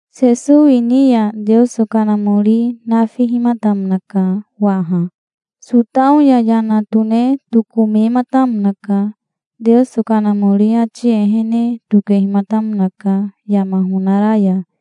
Sesowi ni ya Teoso Kanamori nafihimatamonaka waha. Sotao ya yana tone tokomematamonaka. Teoso Kanamori ati ehene tokehimatamonaka yama honara ya,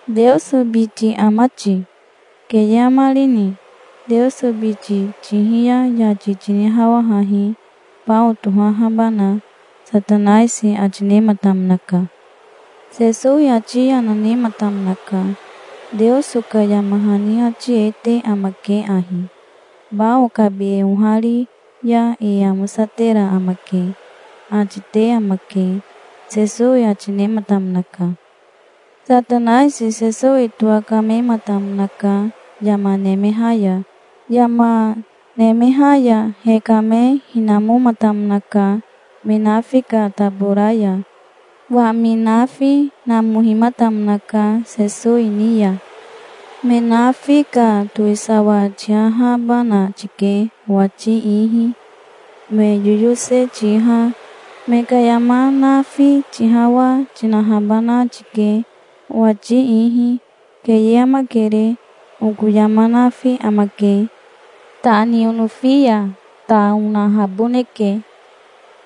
"Teoso biti ama ti? Keye amarini? Teoso biti tihi ya yati tinihawahahi, bao tohahabana", Satanaisi ati nematamonaka. Sesowi ati yana nematamonaka. "Teoso ka yama hani ati e te amake ahi: 'Bao kabi e ohari ya e amosatera amake', ati te amake", Sesowi ati nematamonaka. Satanaisi Sesowi towakamematamonaka yama nemeha ya. Yama nemeha ya hekame hinamomatamonaka me nafi ka tabora ya. Wami nafi namohimatamonaka Sesowi ni ya. "Me nafi ka towisawa tihahabana tike owati ihi. Me yoyose tiha, me ka yama nafi tihawa, tinahabana tike, owati ihi. Keye amakere, oko yama nafi amake. Ta ni onofi ya ta onahaboneke.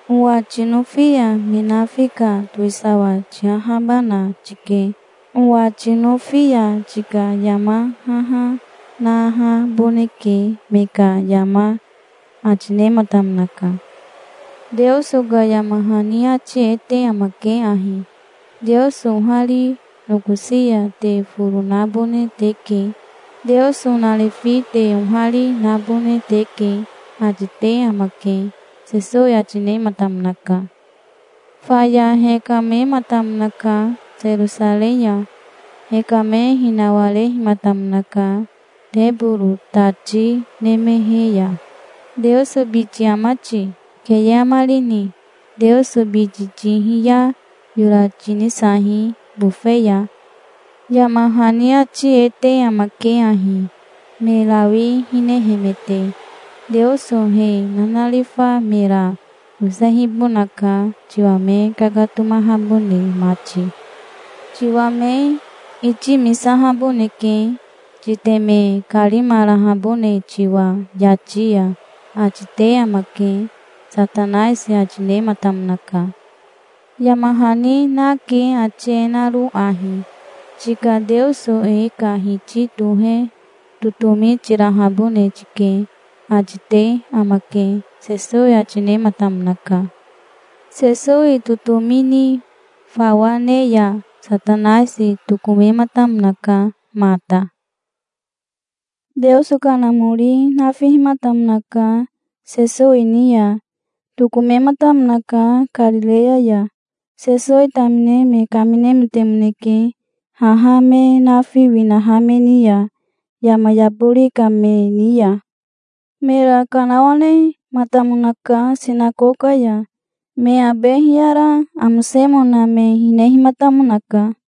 Owa tinofi ya me nafi ka towisawa tihahabana tike. Owa tinofi ya tika yama haha nahaboneke me ka yama", ati nematamonaka. "Teoso ka yama hani ati e te amake ahi: 'Teoso ohari nokosi ya te foro nabone teke. Teoso narifi te ohari nabone teke', ati te amake", Sesowi ati nematamonaka. Faya hekamematamonaka Serosarei ya. Hekame hinawarehimatamonaka teboro tati nemehe ya. "Teoso biti ama ti? Keye amarini? Teoso biti tihi ya yora tinisahi bofe ya. Yama hani ati e te amake ahi, me rawi hinehemete: 'Teoso he nanarifa mera yosehibonaka, tiwa me kakatomahabone mati. Tiwa me itimisahaboneke, titeme karimarahabone tiwa yati ya', ati te amake", Satanaisi ati nematamonaka. "Yama hani nake ati e naro ahi: 'Tika Teoso e ka Hiti tohe totomi tirahabone tike', ati te amake", Sesowi ati nematamonaka. Sesowi totomi ni fawa ne ya Satanaisi tokomematamonaka mata. Teoso Kanamori nafihimatamonaka Sesowi ni ya. Tokomematamonaka Karireya ya. Sesowi tamine me kaminemetemoneke haha me nafi winaha me ni ya, yama yabori ka me ni ya. Mera kanawanematamonaka sinakoka ya. Me abe hiyara amosemona me hinehimatamonaka.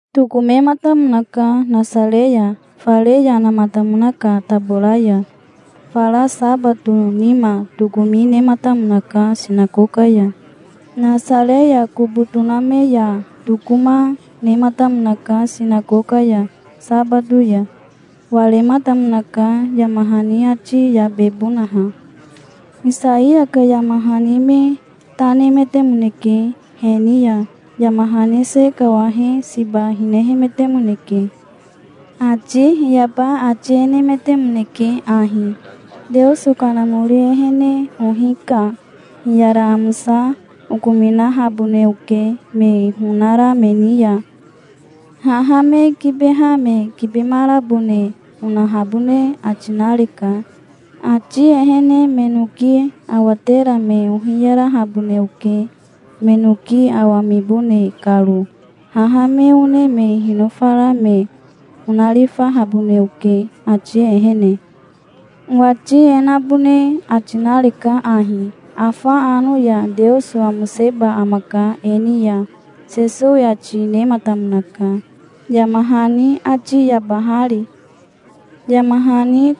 Tokomematamonaka Nasare ya, fare yanamatamona ka tabora ya. Fara sabato nima tokomi nematamonaka sinakoka ya. Nasare ya kobo toname ya tokoma, nematamonaka sinakoka ya sabato ya. Warematamonaka, yama hani ati yabebonaha. Isaiya ka yama hani me ta nemetemoneke he ni ya. Yama hani se kawahe siba hinemetemoneke. Ati hiyaba ati e nemetemoneke ahi: "Teoso Kanamori ehene ohi ka hiyara amosa okominahabone oke me honara me ni ya. Haha me kibeha me kibemarabone onahabone ati nareka. Ati ehene me noki awatera me ohiyarahabone oke me noki awamibone karo. Haha me one me hinofara me onarifahabone oke, ati ehene. Owati e nabone ati nareka ahi: Afa ano ya Teoso amoseba amaka e ni ya", Sesowi ati nematamonaka, yama hani ati yabahari. Yama hani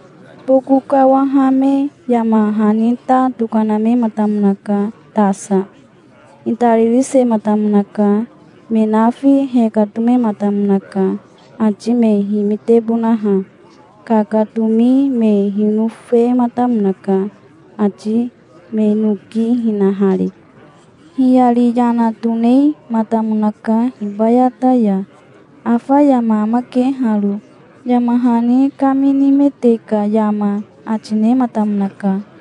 boko kawahame yama hani ta tokanamematamonaka tasa. Itaririsematamonaka. Me nafi hekatomematamonaka, ati me himitebonaha. Kakatomi me hinofematamonaka, ati me noki hinahari. Hiyari yana tonematamonaka hibayata ya. "Afa yama amake haro, yama hani kaminimete ka yama", ati nematamonaka.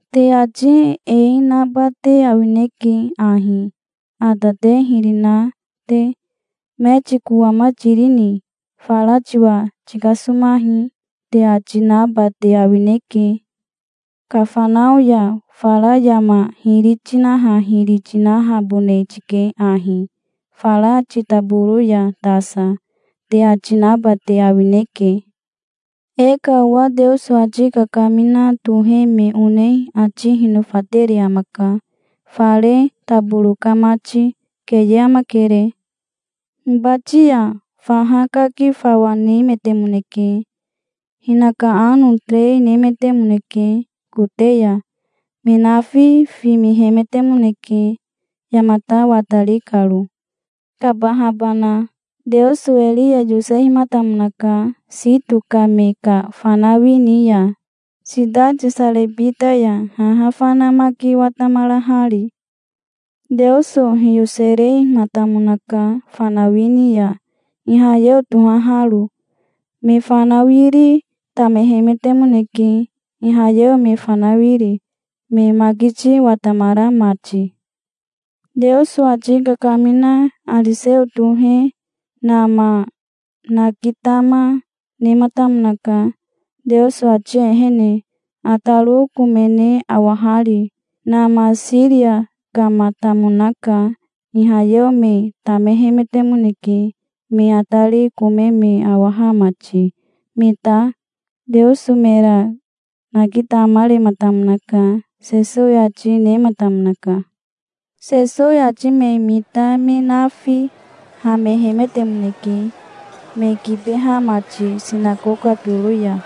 "Te ati e naba te awineke ahi, ata te hiri na te. 'Metiko ama tirini? Fara tiwa tikasomahi', te ati naba te awineke. 'Kafanao ya fara yama hiri tinaha hiri tinahabone tike ahi, fara titaboro ya tasa', te ati naba te awineke. E ka owa Teoso ati kakamina tohe me one ati hinofatere amaka, fare taboro ka mati. Keye amakere. Hibati ya faha kaki fawa nemetemoneke. Hinaka ano terei nemetemoneke kote ya. Me nafi fimihemetemoneke, yamata watari karo, kabahabana. Teoso Eria yosehimatamonaka Sito ka me ka fanawi ni ya, sitati Sarebita ya, haha fana maki watamarahari. Teoso hiyoserematamonaka fanawi ni ya Ihayeo tohaharo. Me fanawiri tamehemetemoneke Ihayeo me fanawiri, me makiti watamara mati. Teoso ati kakamina Ariseo tohe Nama nakitama, nematamonaka, Teoso ati ehene, ataro komene awahari. Nama Siria kamatamonaka. Ihayeo me tamehemetemoneke, me atari kome me awaha mati. Me ta Teoso mera nakitamarematamonaka", Sesowi ati nematamonaka. Sesowi ati me mita me nafi hamehemetemoneke, me kibeha mati sinakoka toro ya.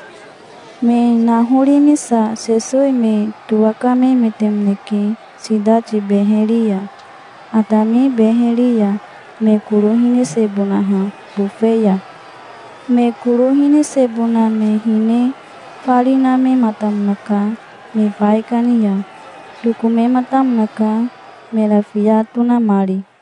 Me nahorimisa Sesowi me towakamemetemoneke sitati beheri ya, atami beheri ya, me koro hinisehibonaha bofe ya. Me koro hinisebona me hine fari namehimatamonaka me baikani ya. Tokomematamonaka, mera fiya tonamari.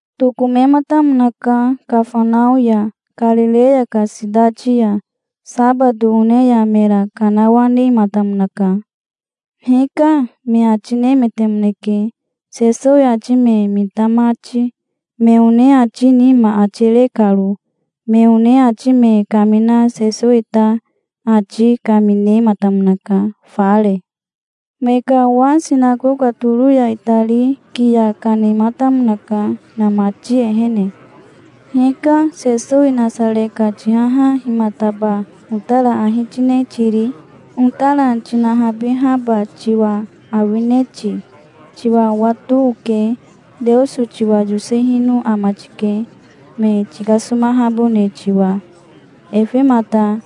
Tokomematamonaka Kafanao ya, Karireya ka sitati ya. Sabato one ya mera kanawanematamonaka. "Hika", me ati nemetemoneke, Sesowi ati me mita mati, me one ati nima ati re karo. Me one ati me kamina Sesowi ta ati kaminematamonaka, fare. Me ka owa sinakoka toro ya itari kiya kanematamonaka inamati ehene. "Hika, Sesowi Nasare ka tihaha himataba otara ahi tine tiri? Otara tinahabihaba tiwa awine ti? Tiwa owato oke. Teoso tiwa yosehino ama tike, me tikasomahabone tiwa. Efemata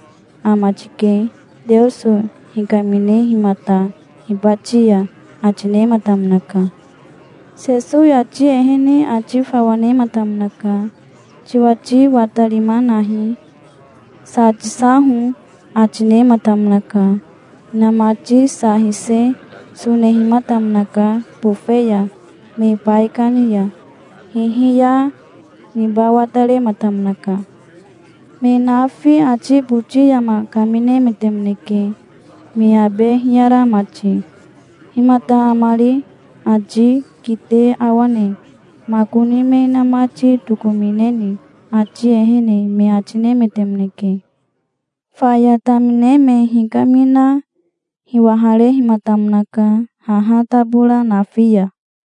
ama tike, Teoso hikaminehimata hibati ya", ati nematamonaka. Sesowi ati ehene ati fawa nematamonaka. "Tiwati watarima nahi. Sa tisaho", ati nematamonaka. Hinamati sa hise sonehimatamonaka bofe ya, me baikani ya. Hihiya niba watarematamonaka. Me nafi ati boti yama kaminemetemoneke, me abe hiyara mati. "Himata amari? Ati kite awane. Makoni me inamati tokomineni, ati ehene", me ati nemetemoneke. Faya tamine me hikamina hiwaharehimatamonaka haha tabora nafi ya.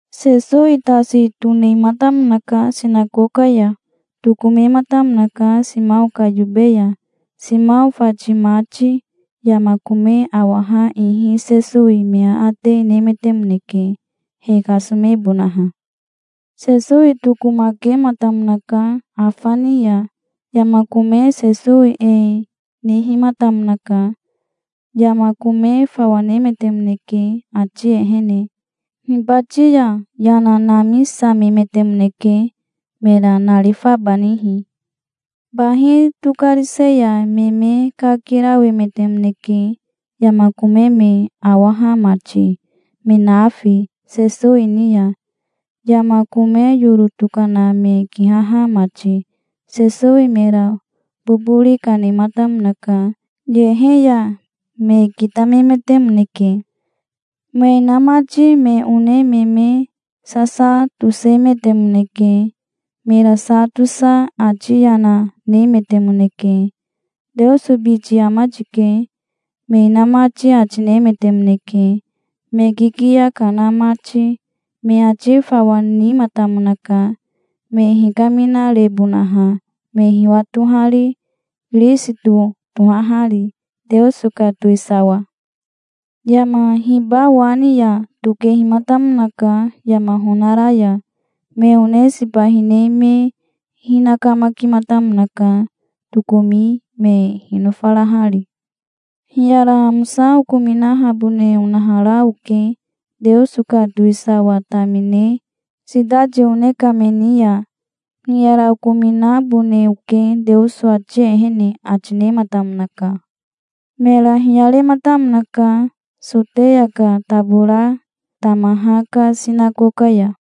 Sesowi tasi tonematamonaka sinakoka ya. Tokomematamonaka Simao ka yobe ya. Simao fati mati yama kome awaha ihi Sesowi me aate nemetemoneke, he kasomebonaha. Sesowi tokomakematamonaka afa ni ya. Yama kome Sesowi e nihimatamonaka. Yama kome fawa nemetemoneke, ati ehene. Hibati ya yana namisamemetemoneke, mera narifabanihi. Bahi tokarise ya me me kakirawemetemoneke, yama kome me awaha mati, me nafi, Sesowi ni ya, yama kome yoro tokana me kihaha mati. Sesowi mera bobori kanematamonaka, yehe ya. Me kitamemetemoneke. Me inamati me one me me sasa tosemetemoneke. Mera sa tosa ati yana nemetemoneke. "Teoso biti ama tike", me inamati ati nemetemoneke, me kikiya kana mati. Me ati fawa nimatamonaka, me hikaminarebonaha, me hiwatohari, Kirisito tohahari, Teoso ka towisawa. Yama hiba wa ni ya tokehimatamonaka yama honara ya. Me one siba hine me hinakamakimatamonaka, tokomi me hinofarahari. "Hiyara amosa okominahabone onahara oke, Teoso ka towisawa tamine, sitati one ka me ni ya. Hiyara okominabone oke Teoso ati ehene", ati nematamonaka. Mera hiyarematamonaka Soteya ka tabora tamaha ka sinakoka ya.